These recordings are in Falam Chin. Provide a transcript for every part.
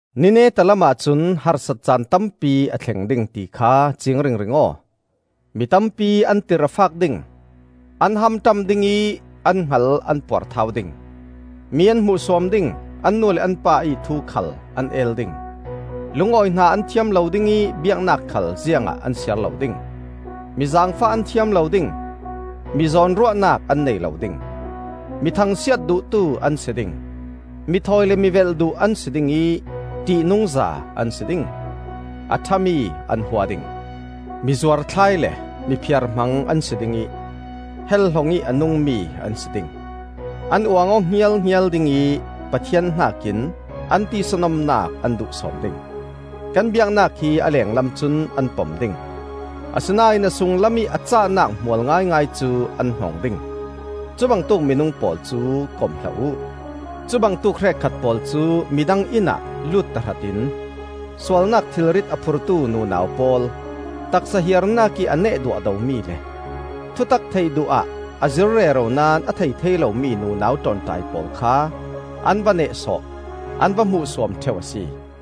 Ni neta lamah cun harsat caan tampi a thleng ding ti kha ciing ringring aw. Mi tampi an tirh a fak ding, an hamṭam dingih an hngal an puarthau ding. Mi an hmuhsuam ding, an nu le an pa ih thu khal an el ding, lungawi hna an thiam lo ding ih biaknak khal ziangah an siar lo ding. Mi zaangfah an thiam lo ding, mizawn ruahnak an nei lo ding, mi thangsiat duhtu an si ding, mithawi le mivelh duh an si ding ih ṭihnungza an si ding. A ṭhami an hua ding. Mi zuarthlai le mi phiarhmang an si ding ih helhlong ih a nungmi an si ding; an uang aw hngialhngial ding ih Pathian hnakin an tisa nomnak an duh sawn ding. Kan biaknak hi a lenglam cun an pom ding; asinain a sunglam ih a cahnak hmual ngaingai cu an hnong ding. Cubangtuk minung pawl cu kom hlah uh. Cubangtuk hrekkhat pawl cu midang innah lut tahratin sualnak thilrit a phurtu nunau pawl, taksa hiarnak ih a neh duahdomi le, thutak theih duh ah a zir rero naón a thei thei lomi nunau ṭawnṭai pawl kha an va nehsawh, an va hmuhsuam ṭheu a si.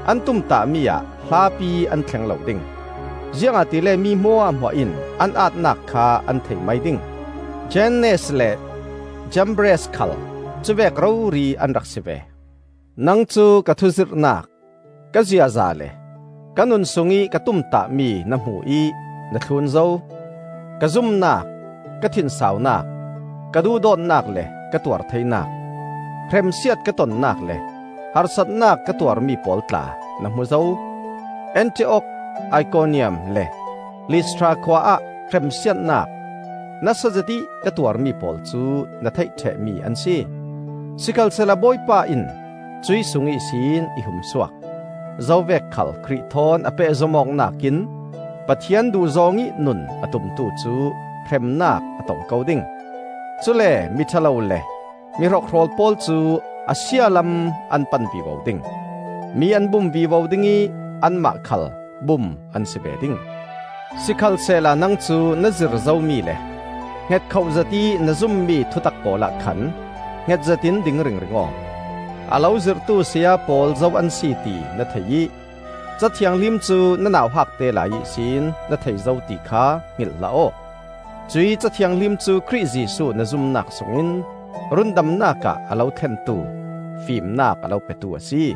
An tumtahmi-ah hlapi an thleng lo ding; ziangahtile mi hmuahhmuah in an aatnak kha an thei mai ding. Jannes le Jambres khal cu vek rori an rak si ve. Nang cu ka thuzirhnak, ka ziaza le ka nun sungih ka tumtahmi na hmu ih na thlun zo. Ka zumnak, ka thinsaunak, ka duhdawtnak le ka tuar theinak, hremsiat ka tonnak le harsatnak ka tuarmi pawl tla na hmu zo. Antiok, Ikoniam le Listra khua ah hremsiatnak nasa zetih ka tuarmi pawl cu na theih ṭhehmi an si. Sikhalsehla Bawipa in cuih sung ihsin i hum suak. Zovek khal Khrih thawn a pehzom awknak in Pathian duhzawng ih nun a tumtu cu hremnak a tong ko ding. Cule miṭha lo le mi hrokhrawl pawl cu a sia lam an pan vivo ding; mi an bum vivo ding ih anmah khal bum an si ve ding. Sikhalsehla nang cu na zir zomi le hngetkhoh zetih na zummi thutak pawlah khan hnget zetin ding ringring aw. A lo zirhtu saya pawl zo an si ti na thei ih, Ca Thianghlim cu na nauhakte lai ihsin na thei zo ti kha hngilh hlah aw. Cuih Ca Thianghlim cu Khrih Jesuh na zumnak sungin rundamnak ah a lo thlentu, fimnak a lo petu a si.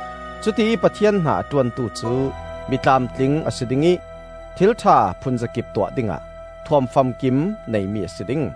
Cutiih Pathian hna a ṭuantu cu mi tlamtling a si ding ih thil ṭha phunzakip tuah dingah thuam famkim neimi a si ding.